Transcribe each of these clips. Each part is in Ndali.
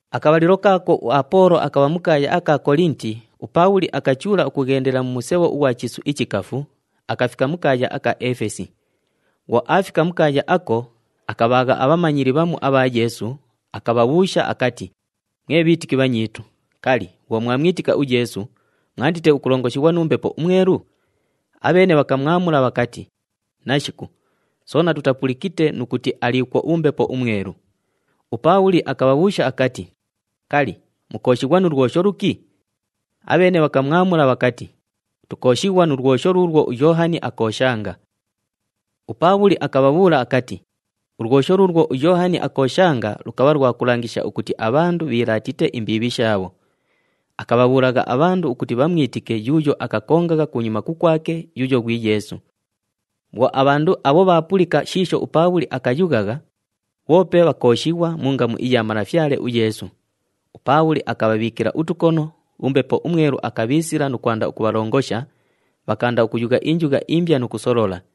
Akabhalilo kaako uApoolo akabha mu kaaya aka Kolinti, uPaabhuli akachuula ukughendela mu musebho ughwa mu chiisu ichikafu, akafika mu kaaya aka Efesi. Bhwo aafika mu kaaya ako, akabhaagha abhamanyili bhamu abha Yeesu, akabhabhuusha akati, “Mwe bhiitiki bhanyiitu, kali, bhwo mwamwitika uYeesu, mwandite ukulongoshighwa nu Mbepo uMwelu?” Abheene bhakamwamula bhakati, “Nashiku, soona tutapulikite nu kuti aliikwo uMbepo uMwelu.” UPaabhuli akabhabhuusha akati, “Kali, mukooshighwa nu lwosho luki?” Abheene bhakamwamula bhakati, “Tukooshighwa nu lwosho luulwo uYoohani akooshanga.” UPaabhuli akabhabhuula akati, “Ulwosho luulwo uYoohani akooshanga lukabha lwa kulangisha ukuti abhandu bhiilaatite imbiibhi shaabho. Akabhabhuulagha abhandu ukuti bhamwitike yuuyo akakongagha kunyuma kukwake, yuuyo ghwi Yeesu.” Bhwo abhandu abho bhaapulika shiisho uPaabhuli akayughagha, bhoope bhakooshighwa mu ngamu iya Malafyale uYeesu. UPaabhuli akabhabhiikila utukono, uMbepo uMwelu akabhiisila nu kwanda ukubhalongosha, bhakaanda ukuyugha injugha imbya nu kusolola.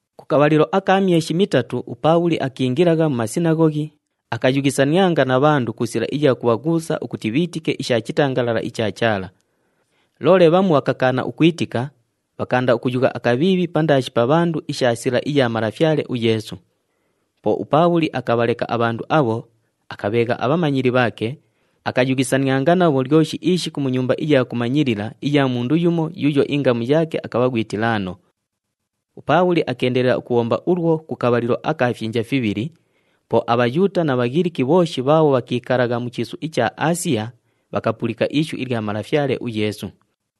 Ku kabhalilo aka myeshi mitatu uPaabhuli akiingilagha mu sinaghoghi, akayughisanianga na bhandu ku sila iya kubhaghuusa ukuti bhiitike isha chitangalala icha Chaala. Loole bhamu bhakakaana ukwitika, bhakaanda ukuyugha akabhiibhi pandaashi pa bhandu isha Sila iya Malafyale uYeesu. Po uPaabhuli akabhaleka abhandu abho, akabheegha abhamanyili bhaake, akayughisanianga nabho lyoshi ishiku mu nyumba iya kumanyilila iya mundu yumo yuuyo ingamu yaake akabha ghwi Tilaano. UPaabhuli akeendelela ukubhomba ulwo ku kabhalilo aka fyinja fibhili, po aBhayuuta na Bhaghiliki bhooshi bhaabho bhakiikalagha mu chiisu icha Aasiya bhakapulika ishu ilya Malafyale uYeesu.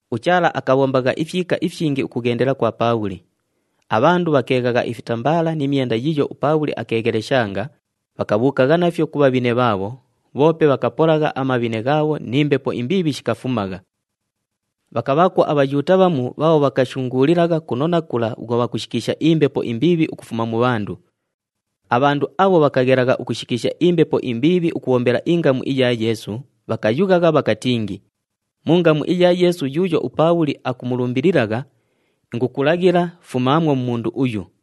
UChaala akabhombagha ifyika ifyingi ukughendela kwa Paabhuli. Abhandu bhakeeghagha ifitambaala ni myenda yiiyo uPaabhuli akeegheleshanga, bhakabhuukagha nafyo ku bhabhine bhaabho, bhoope bhakapolagha amabhine ghaabho ni mbepo imbiibhi shikafumagha. Bhakabhaakwo aBhayuuta bhamu bhaabho bhakashunguulilagha kuno na kula bhwo bhakushikiisha imbepo imbiibhi ukufuma mu bhandu. Abhandu abho bhakaghelagha ukushikiisha imbepo imbiibhi ukubhombela ingamu iya Yeesu, bhakayughagha bhakatingi, “Mu ngamu iya Yeesu yuuyo uPaabhuli akumulumbililagha, ingukulaghila fumaamwo mu mundu uyu.”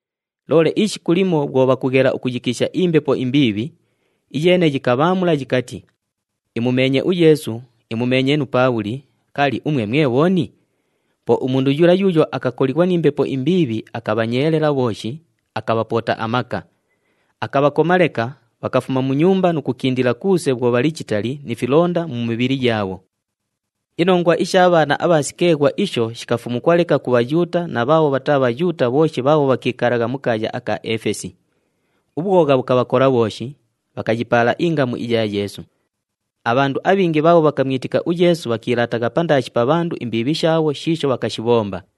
Loole ishiku limo bhwo bhakughela ukuyikiisha imbepo imbiibhi, iyeene yikabhaamula yikati, “Imumeenye uYeesu, imumeenye nu Paabhuli, kali, umwe mwe bhooni?” Po umundu yula yuuyo akakolighwa ni mbepo imbiibhi akabhanyeelela bhooshi, akabhapoota amaka. Akabhakoma leka, bhakafuma mu nyumba nu kukindila kuuse bhwo bhali chitali ni filonda mu mibhili yaabho. Inongwa isha bhaana abha Sikeeghwa isho shikafumukwa leka ku Bhayuuta na bhaabho bhataa Bhayuuta bhooshi bhaabho bhakiikalagha mu kaaya aka Efesi. Ubhwogha bhukabhakola bhooshi, bhakayipaala ingamu iya Yeesu. Abhandu abhingi bhaabho bhakamwitika uYeesu bhakiilaatagha pandaashi pa bhandu imbiibhi shaabho shiisho bhakashibhomba.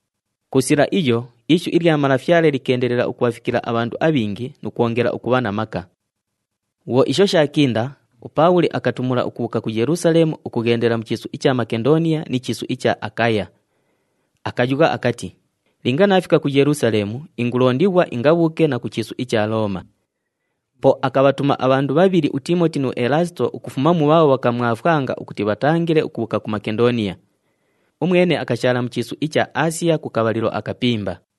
Ku sila iyo ishu ilya Malafyale likeendelela ukubhafikila abhandu abhingi nu kwongela ukubha na maka. Bhwo shooshi isho shaakinda, uPaabhuli akatumula ukubhuuka ku Yelusaleemu ukughendela mu chiisu icha Makendooniya ni chiisu icha Akaya. Akayugha akati, “Linga naafika ku Yelusaleemu ingulondighwa ingabhuuke na ku chiisu icha Looma.” Po akabhatuma abhandu bhabhili uTiimoti nu Elaasito ukufuma mu bhaabho bhakamwafwanga ukuti bhatangile ukubhuuka ku Makendooniya. Umwene akashaala mu chiisu icha Aasiya ku kabhalilo akapimba.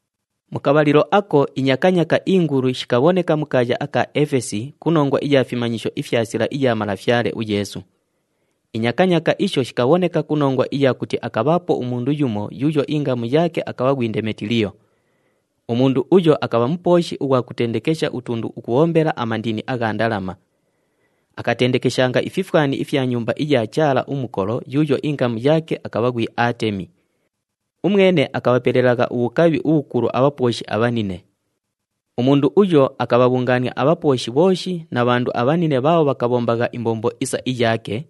Mu kabhalilo ako inyakanyaaka ingulu shikabhoneka mu kaaya aka Efesi ku nongwa iya fimanyisho ifya Sila iya Malafyale uYeesu. Inyakanyaaka isho shikabhoneka ku nongwa iya kuti akabhaapo umundu yumo yuuyo ingamu yaake akabha ghwi Ndemetiliyo. Umundu uyo akabha mupooshi ughwa kutendekesha utundu ukubhombela amandini agha ndalama. Akatendekeshanga ififwani ifya nyumba iya chaala umukolo yuuyo ingamu yaake akabha ghwi Aatemi. Umwene akabhapelelagha ubhukabhi ubhukulu abhapooshi abhanine. Umundu uyo akabhabhungaania abhapooshi bhooshi na bhandu abhanine bhaabho bhakabhombagha imbombo isa iyaake,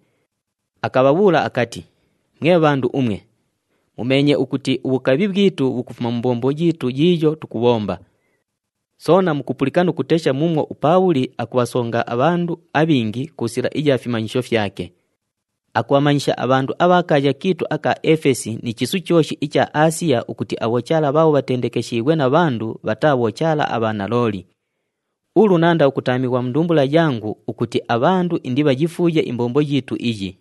akabhabhuula akati, “Mwe bhandu umwe, mumeenye ukuti ubhukabhi bhwitu bhukufuma mu mbombo yiitu yiiyo tukubhomba. Soona mukupulika nu kutesha muumwo uPaabhuli akubhasonga abhandu abhingi ku sila iya fimanyisho fyake. Akubhamanyisha abhandu abha kaaya kiitu aka Efesi ni chiisu chooshi icha Aasiya, ukuti abhochaala bhaabho bhatendekeshiighwe na bhandu bhataa bhochaala abha nalooli. Ulu naanda ukutaamighwa mu ndumbula yangu ukuti abhandu indibhayifuuye imbombo yiitu iyi.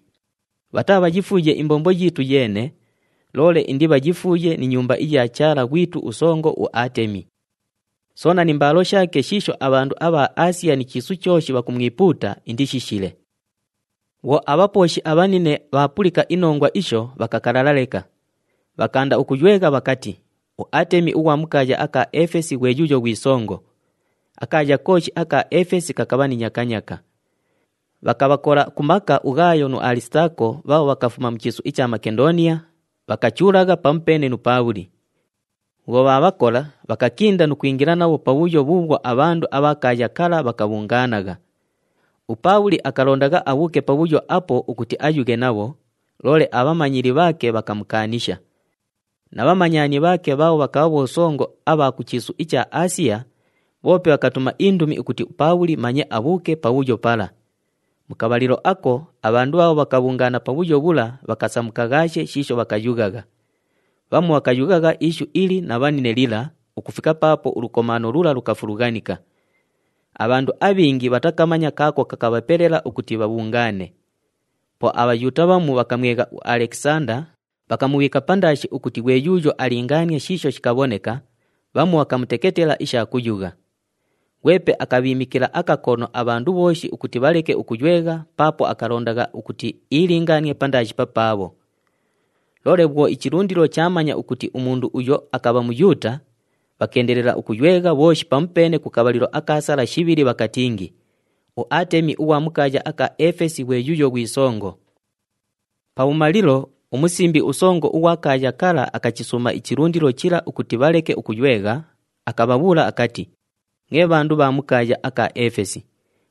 Bhataabhayifuuye imbombo yiitu yeene, loole indibhayifuuye ni nyumba iya chaala ghwitu usongo uAatemi. Soona ni mbaalo shaake shiisho abhandu abha Aasiya ni chiisu chooshi bhakumwipuuta indishishile.” Bhwo abhapooshi abhanine bhaapulika inongwa isho, bhakakalala leka. Bhakaanda ukuywegha bhakati, “UAatemi ughwa mu kaaya aka Efesi ghwe yuuyo ghwi songo!” Akaaya kooshi aka Efesi kakabha ni nyakanyaaka. Bhakabhakola ku maka uGhaayo nu Alisitaako bhaabho bhakafuma mu chiisu icha Makendooniya, bhakachuulagha pamupeene nu Paabhuli. Bhwo bhaabhakola, bhakakinda nu kwingila nabho pabhuyo bhuubhwo abhandu abha kaaya kala bhakabhungaanagha. UPaabhuli akalondagha abhuuke pabhuyo apo ukuti ayughe nabho, loole abhamanyili bhaake bhakamukaanisha. Na bhamanyani bhaake bhaabho bhakabha bhosongo abha ku chiisu icha Aasiya, bhoope bhakatuma indumi ukuti uPaabhuli manye abhuuke pabhuyo pala. Mu kabhalilo ako, abhandu bhaabho bhakabhungaana pabhuyo bhula bhakasamukaghaashe shiisho bhakayughagha. Bhamu bhakayughagha ishu ili na bhanine lila ukufika paapo ulukomaano lula lukafulughanika. Abhandu abhingi bhatakamanya kaako kakabhapela ukuti bhabhungaane. Po aBhayuuta bhamu bhakamwegha uAlekisanda, bhakamubhiika pandaashi ukuti ghwe yuuyo alingaanie shiisho shikabhoneka, bhamu bhakamuteketela isha kuyugha. Ghwepe akabhiimikila akakono abhandu bhooshi ukuti bhaleke ukuywegha paapo akalondagha ukuti iilingaanie pandaashi papaabho. Loole bhwo ichilundilo chaamanya ukuti umundu uyo akabha Muyuuta, bhakeendelela ukuywegha bhooshi pamupeene ku kabhalilo aka sala shibhili bhakatingi, “UAatemi ughwa mu kaaya aka Efesi ghwe yuuyo ghwi songo!” Pabhumalilo, umusimbi usongo ughwa kaaya kala akachisuuma ichilundilo chila ukuti bhaleke ukuywegha, akabhabhuula akati, “Mwe bhandu bha mu kaaya aka Efesi,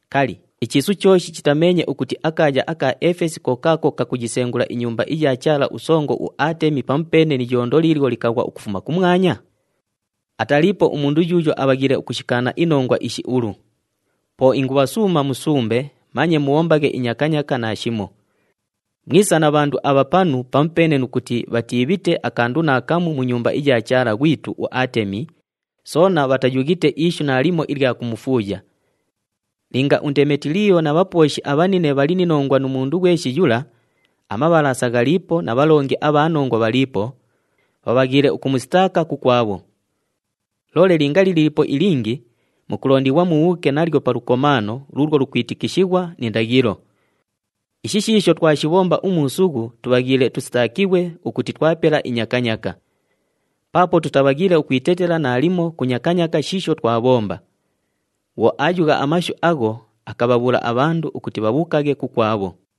kali, ichiisu chooshi chitameenye ukuti akaaya aka Efesi ko kaako kakuyisengula inyumba iya chaala usongo uAatemi, pamupeene ni iyondo liilyo likaghwa ukufuma kumwanya? Ataliipo umundu yuuyo abhaghiile ukushikaana inongwa ishi ulu. Po ingubhasuuma musumbe manye mubhombaghe inyakanyaaka naashimo. Mwisa na bhandu abha panu pamupeene nu kuti bhatiibhite akandu naakamu mu nyumba iya chaala ghwitu uAatemi, soona bhatayughite ishu naalimo ilya kumufuuya. Linga uNdemetiliyo na bhapooshi abhanine bhali ni nongwa nu mundu ghweshi yula, amabhalaasa ghaliipo na bhalongi abha nongwa bhaliipo, bhabhaghiile ukumusitaaka kukwabho. Loole linga liliipo ilingi, mukulondighwa mubhuuke nalyo pa lukomaano luulwo lukwitikishighwa ni ndaghilo. Ishi shiisho twashibhomba umuusughu tubhaghiile tusitaakighwe ukuti twapela inyakanyaaka. Paapo tutabhaghiile ukwitetela naalimo ku nyakanyaaka shiisho twabhomba.” Bhwo aayugha amashu agho, akabhabhuula abhandu ukuti bhabhuukaghe kukwabho.